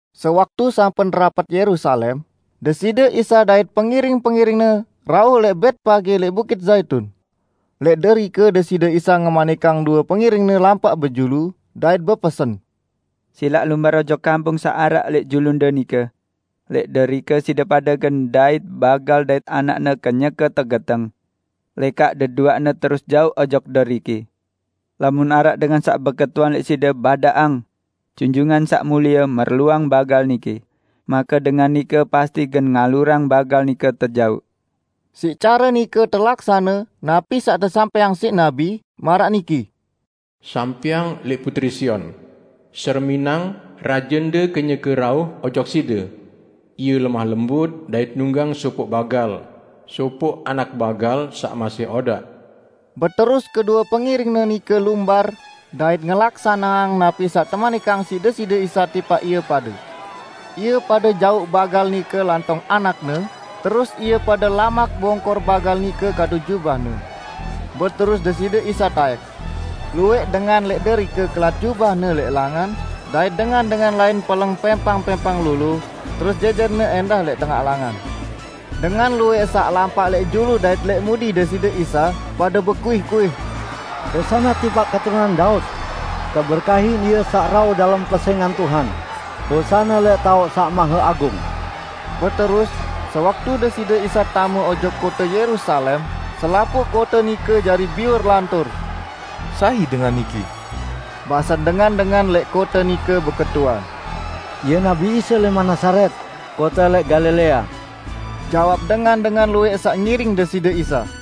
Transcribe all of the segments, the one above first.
Sewaktu sampun rapet Yerusalem, Deside Isa dait pengiring-pengiring-Ne rauh lẽq Betpage lẽq Bukit Zaitun. Lẽq derike Deside Isa ngemanikang due pengiring-Ne lampaq bejulu dait bepesen: "Silaq lumbar ojok kampung saq araq lẽq julunde nike. Lẽq derike side pade gen ndait bagal dait anakne kenyeke tegeteng. Lekaq deduaqne terus jauq ojok deriki. Lamun araq dengan saq beketuan lẽq side, badaqang, 'Junjungan Saq Mulie merluang bagal niki', make dengan nike pasti gen ngalurang bagal nike tejauq." Siq care nike telaksane napi saq tesampẽang siq nabi, maraq niki, "Sampẽang lẽq putri Sion: Sereminang, Rajende kenyeke rauh ojok side. Ie lemah lembut dait nunggang sopoq bagal, sopoq anak bagal saq masih odaq." Beterus kedue pengiring-Ne nike lumbar dait ngelaksaneang napi saq temanikang siq Deside Isa tipaq ie pade. Ie pade jauq bagal nike lantong anakne, terus ie pade lamak bongkor bagal nike kadu jubahne. Beterus Deside Isa taẽk. Luwẽq dengan lẽq derike kelat jubahne lẽq langan, dait dengan-dengan lain peleng pẽmpang-pẽmpang lolo terus jẽjẽrne ẽndah lẽq tengaq langan. Dengan luwẽq saq lampaq lẽq julu dait lẽq mudi Deside Isa pade bekuih-kuih, "Hosana tipaq Keturunan Daud! Teberkahin Ie saq rauh dalem pesẽngan Tuhan! Hosana lẽq taoq saq maheagung!" Beterus, sewaktu Deside Isa tame ojok kote Yerusalem, selapuq kote nike jari biur lantur. "Sai dengan niki?" basen dengan-dengan lẽq kote nike beketuan. "Ie Nabi Isa lẽman Nazaret, kote lẽq Galilea," jawab dengan-dengan luwẽq saq ngiring Deside Isa.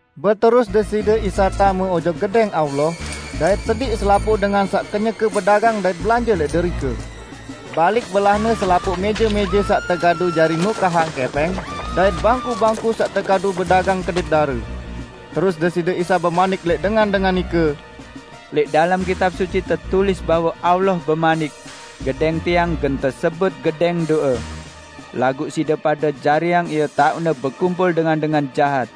Beterus Deside Isa tame ojok Gedẽng Allah, dait sediq selapuq dengan saq kenyeke bedagang dait belanje lẽq derike. Balik belah-Ne selapuq mẽje-mẽje saq tekadu jari nukahang kẽpẽng, dait bangku-bangku saq tekadu bedagang kedit dare. Terus Deside Isa bemanik lẽq dengan-dengan nike, "Lẽq dalem Kitab Suci tetulis bahwe Allah bemanik, 'Gedẽng Tiang gen tesebut gedẽng do'e.' Laguq side pade jariang ie taoqne bekumpul dengan-dengan jahat!"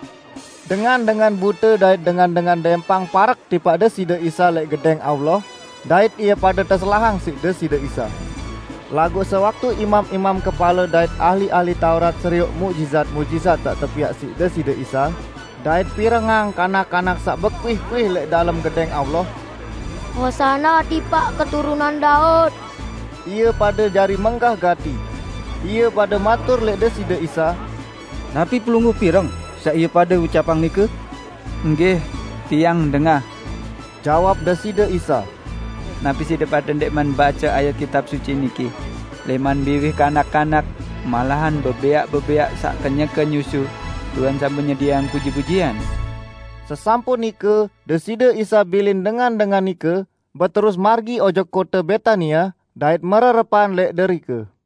Dengan-dengan bute dait dengan-dengan dẽmpang parek tipaq Deside Isa lẽq Gedẽng Allah, dait ie pade teselahang siq Deside Isa. Laguq sewaktu imam-imam kepale dait ahli-ahli Taurat serioq muqjizat-muqjizat saq tepiaq siq Deside Isa dait pirengang kanak-kanak saq bekuih-kuih lẽq dalem Gedẽng Allah: "Hosana tipaq Keturunan Daud!" ie pade jari menggah gati. Ie pade matur lẽq Deside Isa, "Napi Pelungguh pireng saq ie pade ucapang nike?" "Enggih, Tiang dengah," jawab Deside Isa. "Napi side pade ndẽqman bace ayat Kitab Suci niki: 'Lẽman biwih kanak-kanak, malahan bebẽaq-bebẽaq saq kenyeke nyusu, Tuhan sampun nyedieang puji-pujian'?" Sesampun nike Deside Isa bilin dengan-dengan nike, beterus margi ojok kote Betania dait mererepan lẽq derike.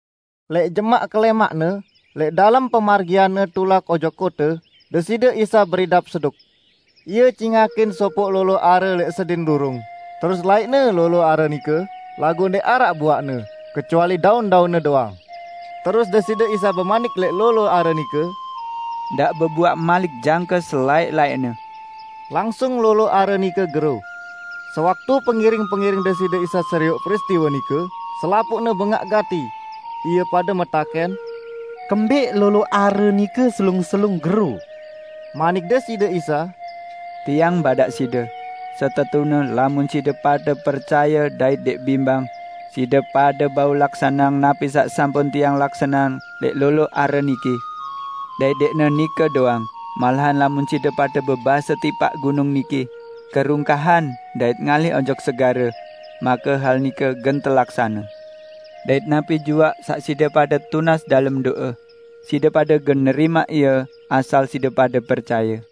Lẽq jemaq kelẽmaqne, lẽq dalem pemargian-Ne tulak ojok kote, Deside Isa beridap seduk. Ie cingakin sopoq lolo are lẽq sedin rurung, terus laiq-Ne lolo are nike, laguq ndẽq araq buaqne, kecuali daun-daunne doang. Terus Deside Isa bemanik lẽq lolo are nike, "Ndaq bebuaq malik jangke selaẽq-laẽqne!" Langsung lolo are nike gero. Sewaktu pengiring-pengiring Deside Isa serioq peristiwe nike, selapuqne bengaq gati. Ie pade metakẽn, "Kembẽq lolo are nike selung-selung gero?" Manik Deside Isa, "Tiang badaq side, setetune lamun side pade percaye dait ndẽq bimbang, side pade bau laksaneang napi saq sampun Tiang laksaneang lẽq lolo are niki. Dait ndẽqne nike doang, malahan lamun side pade bebase tipaq gunung niki, 'Kerungkahan dait ngalih ojok segare!' Make hal nike gen telaksane. Dait napi juaq saq side pade tunas dalem do'e, side pade gen nerimaq ie asal side pade percaye."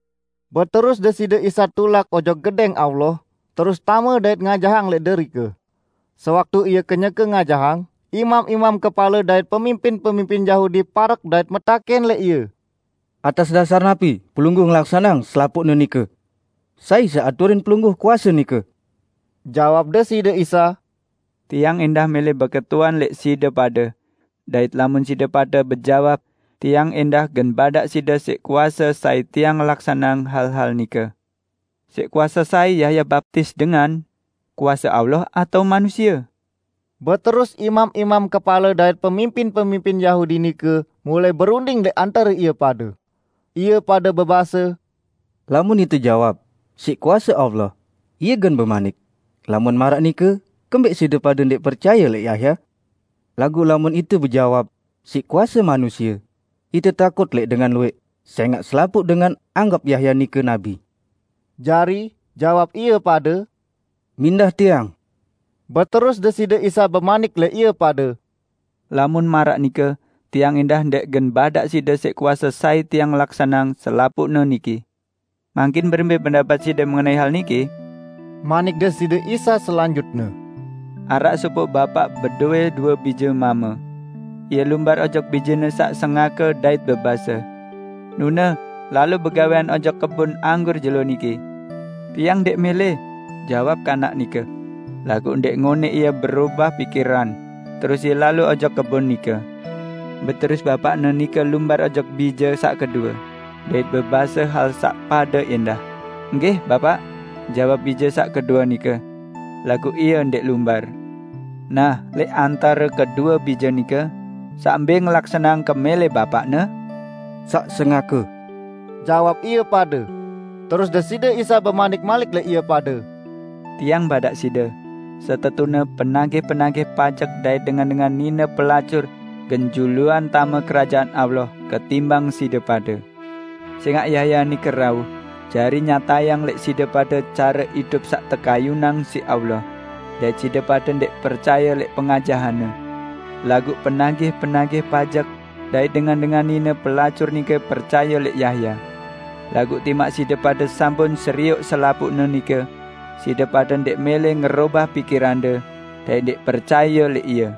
Beterus Deside Isa tulak ojok Gedẽng Allah, terus tame dait ngajahang lẽq derike. Sewaktu Ie kenyeke ngajahang, imam-imam kepale dait pemimpin-pemimpin Yahudi parek dait metakẽn lẽq Ie, "Atas dasar napi Pelungguh ngelaksaneang selapuqne nike? Sai saq aturin Pelungguh kuase nike?" Jawab Deside Isa, "Tiang ẽndah mẽlẽ beketuan lẽq side pade, dait lamun side pade bejawab, Tiang ẽndah gen badaq side siq kuase sai Tiang ngelaksaneang hal-hal nike. Siq kuase sai Yahya baptis dengan? Kuase Allah atao manusie?" Beterus imam-imam kepale dait pemimpin-pemimpin Yahudi nike mulai berunding lẽq antare ie pade. Ie pade bebase, "Lamun ite jawab, 'Siq kuase Allah,' Ie gen bemanik, 'Lamun maraq nike kembẽq side pade ndẽq percaye lẽq Yahya?' Laguq lamun ite bejawab, 'Siq kuase manusie,' ite takut lẽq dengan luwẽq, sẽngaq selapuq dengan anggep Yahya nike nabi." Jari, jawab ie pade, "Mindah tiang." Beterus Deside Isa bemanik lẽq ie pade, "Lamun maraq nike, Tiang ẽndah ndẽq gen badaq side siq kuase sai Tiang ngelaksaneang selapuqne niki." "Mangkin berembẽ pendapet side mengenai hal niki?" manik Deside Isa selanjutne. "Araq sopoq bapaq bedowẽ due bije mame. Ie lumbar ojok bijene saq sengake dait bebase, 'Nune, lalo begawẽan ojok kebon anggur jelo niki.' 'Tiang ndẽq mẽlẽ,' jawab kanak nike. Laguq ndẽq ngonẽq ie berobah pikiran, terus ie lalo ojok kebon nike. Beterus bapaqne nike lumbar ojok bije saq kedue, dait bebase hal saq pade ẽndah. 'Enggih, Bapaq,' jawab bije saq kedue nike. Laguq ie ndẽq lumbar. Nah, lẽq antare kedue bije nike, saq mbẽ ngelaksaneang kemẽlẽq bapaqne?" "Saq sengake," jawab ie pade. Terus Deside Isa bemanik malik lẽq ie pade, "Tiang badaq side, setetune penagih-penagih pajek dait dengan-dengan nine pelacur gen juluan tame Kerajaan Allah ketimbang side pade. Sẽngaq Yahya nike rauh, jari nyatayang lẽq side pade care idup saq tekayunang siq Allah, dait side pade ndẽq percaye lẽq pengajahanne; laguq penagih-penagih pajek dait dengan-dengan nine pelacur nike percaye lẽq Yahya. Laguq timaq side pade sampun serioq selapuqne nike, side pade ndẽq mẽlẽ ngerobah pikirande dait ndẽq percaye lẽq ie."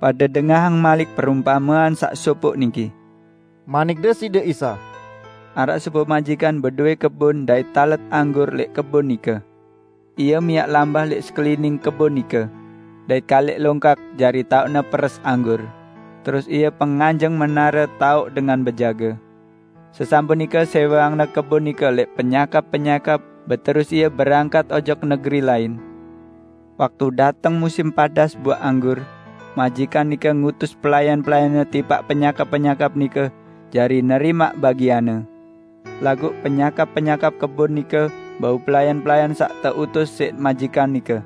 "Pade dengahang malik perumpamean saq sopoq niki," manik Deside Isa. "Araq sopoq majikan bedowẽ kebon dait talet anggur lẽq kebon nike. Ie miaq lambah lẽq sekelining kebon nike, dait kaliq longkak jari taoqne peres anggur, terus ie penganjeng menare taoq dengan bejage. Sesampun nike sẽweangne kebon nike lẽq penyakap-penyakap, beterus ie berangkat ojok negeri negeri lain. Waktu dateng musim padas buaq anggur, majikan nike ngutus pelayan-pelayanne tipaq penyakap-penyakap nike jari nerimaq bagianne. Laguq penyakap-penyakap kebon nike bau pelayan-pelayan saq teutus siq majikan nike: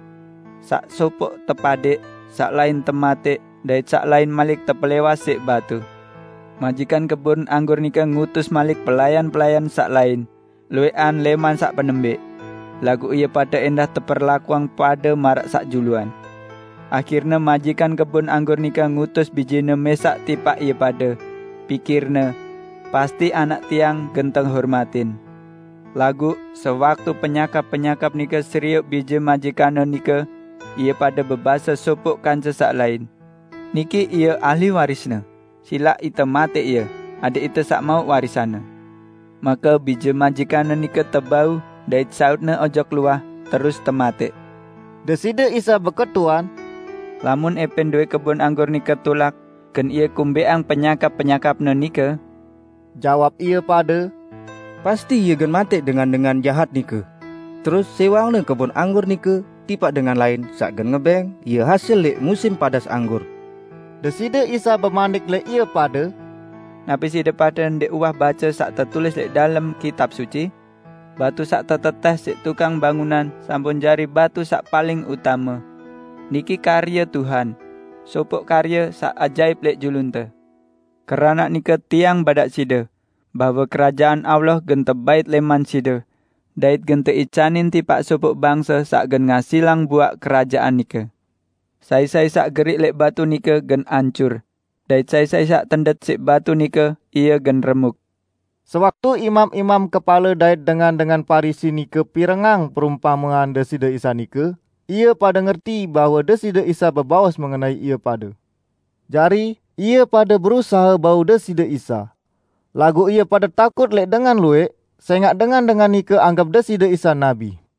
Saq sopoq tepadek, saq lain tematẽq dait saq lain malik tepelẽwas siq batu. Majikan kebon anggur nike ngutus malik pelayan-pelayan saq lain, luwẽqan lẽman saq penembẽq. Laguq ie pade ẽndah teperlakuang pade maraq saq juluan. Ahirne majikan kebon anggur nike ngutus bijene mẽsaq tipaq ie pade, pikirne, 'Pasti anak tiang gen tehormatin.' Laguq sewaktu penyakap-penyakap nike serioq bije majikanne nike, ie pade bebase sopoq kance saq lain, 'Niki ie ahli warisne, silaq ite matẽq ie, adẽq ite saq mauq warisanne!' Make bije majikanne nike tebau, dait sautne ojok luah, terus tematẽq." Deside Isa beketuan, "Lamun ẽpẽn dowẽ kebon anggur nike tulak, gen ie kumbẽqang penyakap-penyakapne nike?" Jawab ie pade, "Pasti ie gen matẽq dengan-dengan jahat nike, terus sẽweangne kebon anggur nike tipaq dengan lain saq gen ngebẽng ie hasil lẽq musim padas anggur." Deside Isa bemanik lẽq ie pade, "Napi side pade ndẽq uwah bace saq tetulis lẽq dalem Kitab Suci? 'Batu saq tetetẽh siq tukang bangunan sampun jari batu saq paling utame. Niki karye Tuhan; sopoq karye saq ajaip lẽq julunte!' " "Keranaq nike Tiang badaq side, bahwe Kerajaan Allah gen tebait lẽman side, dait gen teicanin tipaq sopoq bangse saq gen ngasilang buaq Kerajaan nike. [ Sai-sai saq geriq lẽq batu nike gen ancur; dait sai-sai saq tendet siq batu nike, ie gen remuk.]" Sewaktu imam-imam kepale dait dengan-dengan Parisi nike pirengang perumpamean Deside Isa nike, ie pade ngerti bahwe Deside Isa bebaos mengenai ie pade. Jari, ie pade berusahe bau Deside Isa. Laguq ie pade takut lẽq dengan luwẽq, sẽngaq dengan-dengan nike anggep Deside Isa nabi.